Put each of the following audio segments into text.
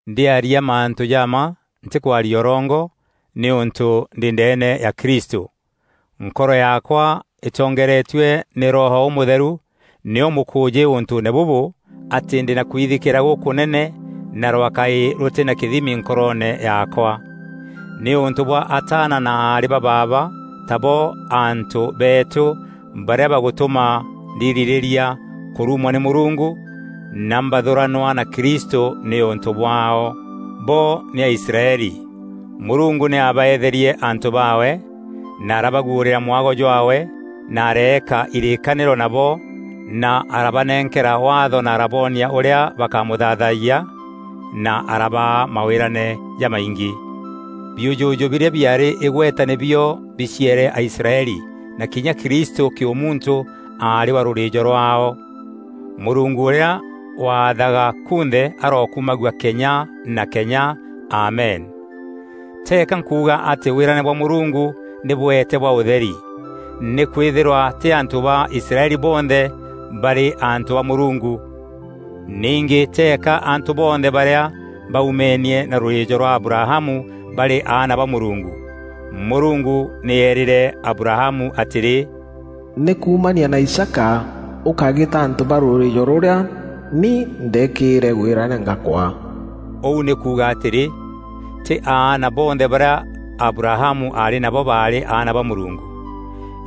Ndîarîa mantû ja mma, ntîkwaria ûrongo, nîûntû ndî ndeene ya Kristû. Nkoro yaakwa îtongeeretue nî Roho Ûmûtheru nîyo mûkûûjî ûntûûne bûbû atî ndî na kwithikîîra gûkûnene na rwakaî rûtî na kîthimi nkoroone yaakwa, nîûntû bwa ataana na aarî ba baaba, tabo antû beetû, barîa bagûtûma ndirîrîria kûrumwa nî Mûrungu na mbathûranwa na Kristû nîûntû bwaao. Bo nî Aisraeli, Mûrungu nî abaeetherie antû baawe, na arabaguûrîra mwago jwaawe na areeka irîîkanîro nabo na arabanenkera Waatho na araboonia ûrîa bakamûthaathayia na arabaa mawîrane jamaingî. Biûjûjû birîa biaarî îgweta nî bio biciere Aisraeli na kinya Kristû kîûmuntû aarî wa rûrîîjo rwaao. Mûrungu ûrîa waathaga kunthe arokumagua kenya na kenya! Amen. Teeka nkuuga atî wîrane bwa Mûrungu nî bweete bwa ûtheri; nîkwîthîrwa tî antû ba Israeli bonthe barî antû ba Mûrungu. Ningî teeka antû bonthe barîa baumenie na rûrîîjo rwa Abrahamu barî aana ba Mûrungu. Mûrungu nî eerîre Abrahamu atîrî, “Nî kuumania na Isaaka ûkagîta antû ba rûrîîjo rûrîa ni ndeekîre wîrane ngakwaa.” Ûu nî kuuga atîrî, tî aana bonthe barîa Abrahamu aarî nabo baarî aana ba Mûrungu.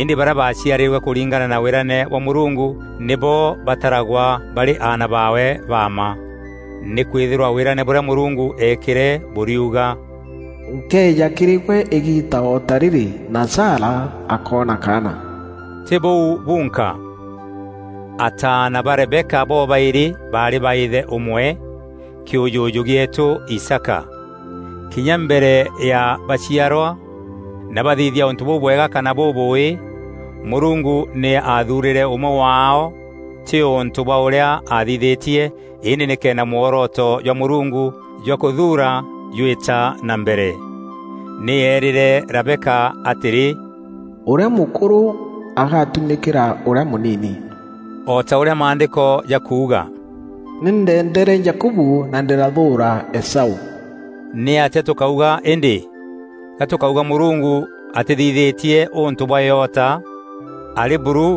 Îndî barîa baaciarîrwe kûringana na wîrane bwa Mûrungu nîbo bataragwa barî aana baawe ba mma. Nîkwîthîrwa wîrane bûrîa Mûrungu eekîre bûriuga: “Nkeeja kîrî gwe îgiita o ta rîrî, na Sara akoona kaana.” Tî bûu bunka. Ataana ba Rebeka bobaîrî baarî ba îthe ûmwe, kîûjûjû gîeetû Isaaka. Kinya mbere ya baciarwa na bathithia ûntû bûbwega kana bûbûûî, Mûrungu nî aathuurîre ûmwe waao tî ûntû bwa ûrîa aathithîtie, îndî nîkenda mworoto jwa Mûrungu jwa kûthuura jwîta na mbere. Nî eerîre Rebeka atîrî, “Ûrîa mûkûrû agatumîkîra ûrîa mûnini.” O ta ûrîa Maandîko jakuuga, “Nî ndeendere Jakubu na ndîrathûûra Esaû.” Nîatîa tûkauga îndî? Ga tûkauga Mûrungu atîthithîtie ûntû bwa îota? Arî buru!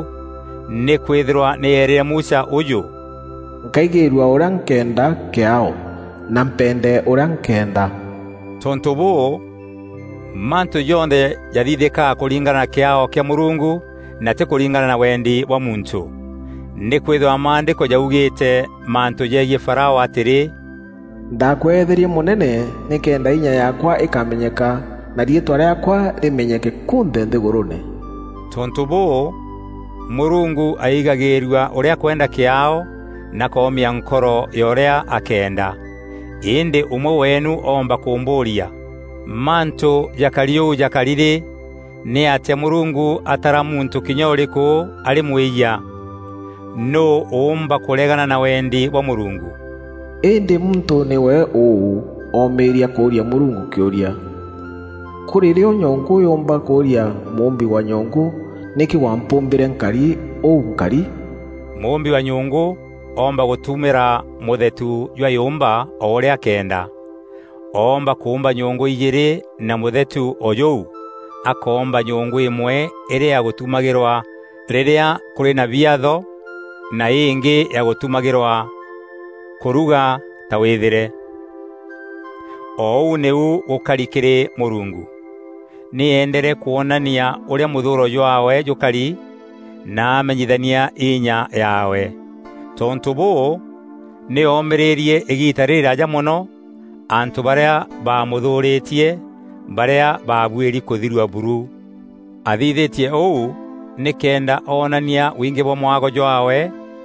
Nîkwîthîrwa nî eerîre Musa ûjû: “Nkaigîrua ûrîa nkeenda kîaao na mpende ûrîa nkeenda.” Tontû bûû, mantû jonthe jathithîkaga kûringana na kîaao kîa Mûrungu, na tî kûringana na wendi bwa muntû. Nîkwîthîrwa Maandîko jaugîîte mantû jegiî Farao atîrî, “Ndakweetherie mûnene nîkenda inya yaakwa îkamenyeka na riîtwa rîaakwa rîmenyeke kunthe nthîgûrûûne.” Tontû bûû, Mûrungu aigagîîrua ûrîa akwenda kîaao na akoomia nkoro ya ûrîa akeenda. Îndî ûmwe weenu oomba kûmbûûria, “Mantû jakari ûu jakari rî, nîatîa Mûrungu atara muntû kinya ûrîkû arî mwîyia? Nûû ûûmba kûregana na wendi bwa Mûrungu?” Îndî muntû, nîwe ûû, omîîria kûûria Mûrungu kîûria? Kûrî rîo nyongû yûûmba kûûria mûûmbi wa nyongû, “Nîkî wampûmbîre nkari ûu nkari?” Mûûmbi wa nyongû oomba gûtumîra mûthetu jwa yûmba o ûrîa akeenda. Oomba kûûmba nyongû ijîîrî na mûthetu o jûu; akoomba nyongû îmwe îrî ya gûtumagîrwa rîrîa kûrî na biatho na îngî ya gûtumagîrwa kûruga ta wîthîre. O ûu nîu gûkari kîrî Mûrungu. Nî eendere kwonania ûrîa mûthûûro jwaawe jûkari na amenyithania inya yaawe. Tontû bûû, nî oomîîrîrie îgiita rîrîraaja mono, antû barîa baamûthûûrîtie, barîa babuîri kûthirua buru. Athithîtie ûu nîkenda onania wingî bwa mwago jwaawe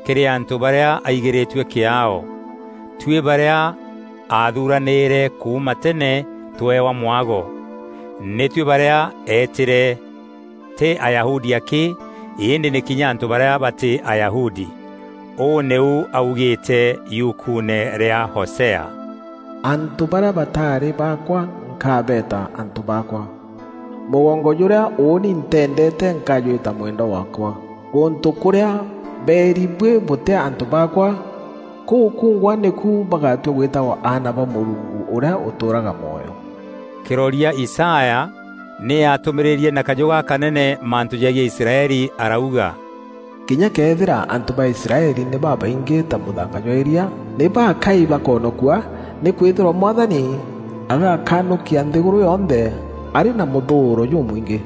kîrî antû barîa aigîrîtue kîaao; tuî barîa aathuranîîre kuuma tene tweewa mwago. Nî tuî barîa eetîre, tî Ayahudi akî, îndî nî kinya antû barîa batî Ayahudi. Ûû nîu augîîte yukuune rîa Hosea: “Antû barîa bataarî baakwa nkabeeta ‘Antû baakwa.’ Mûgongo jûrîa ûûni nteendeete, nkajwîta ‘Mwendwa waakwa.’ Gûntû kûrîa beeri ‘Buî bûtî antû baakwa!’ Kûu kungwa nîku bagatua gwîtagwa ‘Aana ba Mûrungu ûrîa ûtûûraga mwoyo.’” Kîroria Isaya nî aatûmîîrîrie na kajû gakanene mantû jegiî Israeli arauga: “Kinya këethîra antû ba Israeli nî babaingî ta mûthanga jwa îria, nî baakai bakonokua; nîkwîthîrwa Mwathani agakanûkia nthîgûrû yonthe arî na mûthûûro jûmwingî.”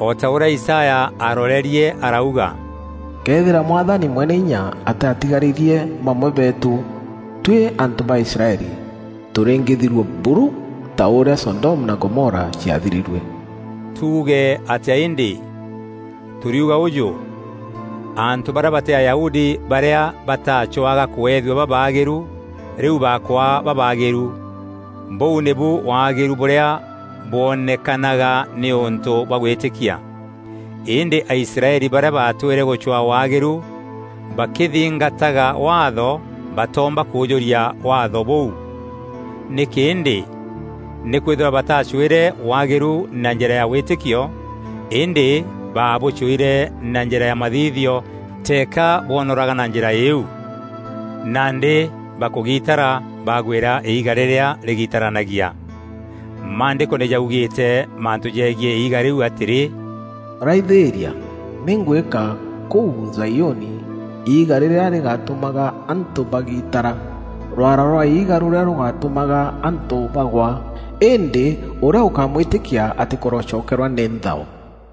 O ta ûrîa Isaya aarorerie arauga, “Këethîra Mwathani Mweneinya ataatigarîrie bamwe beetû, tuî antû ba Israeli, tûrîngîthirua buru ta ûrîa Sodomu na Gomora ciathirîrue.” Tuuge atîa îndî? Tûriuga ûjû: antû barîa batî Ayahudi barîa bataacûaga kûethua babaagîru, rîu bakwaa babaagîru. Bûu nîbu waagîrû bûrîa bwonekanaga nîûntû bwa gwîtîkia. Îndî Aisraeli barîa baatwîre gûcwaa waagîru bakîthingataga Waatho, batoomba kûûjûria Waatho bûu. Nîkî îndî? Nîkwîthîrwa batacwîre waagîru na njîra ya wîtîkio îndî baabûcûîre na njîra ya mathithio teeka bwonoraga na njîra iû. Nandî bakûgitara bagwîra Iiga rîrîa rîgitaranagia. Maandîko nî jaugîîte mantû jegiî iiga rîu atîrî, “Raithîîria nî ngwîka kûu Zaiûni, iiga rîrîa rîgatûmaga antû bagiitara, rwaara rwa iiga rûrîa rûgatûmaga antû bagwa. Îndî ûrîa ûkamwîtîkia atîkorocokerwa nî nthao.”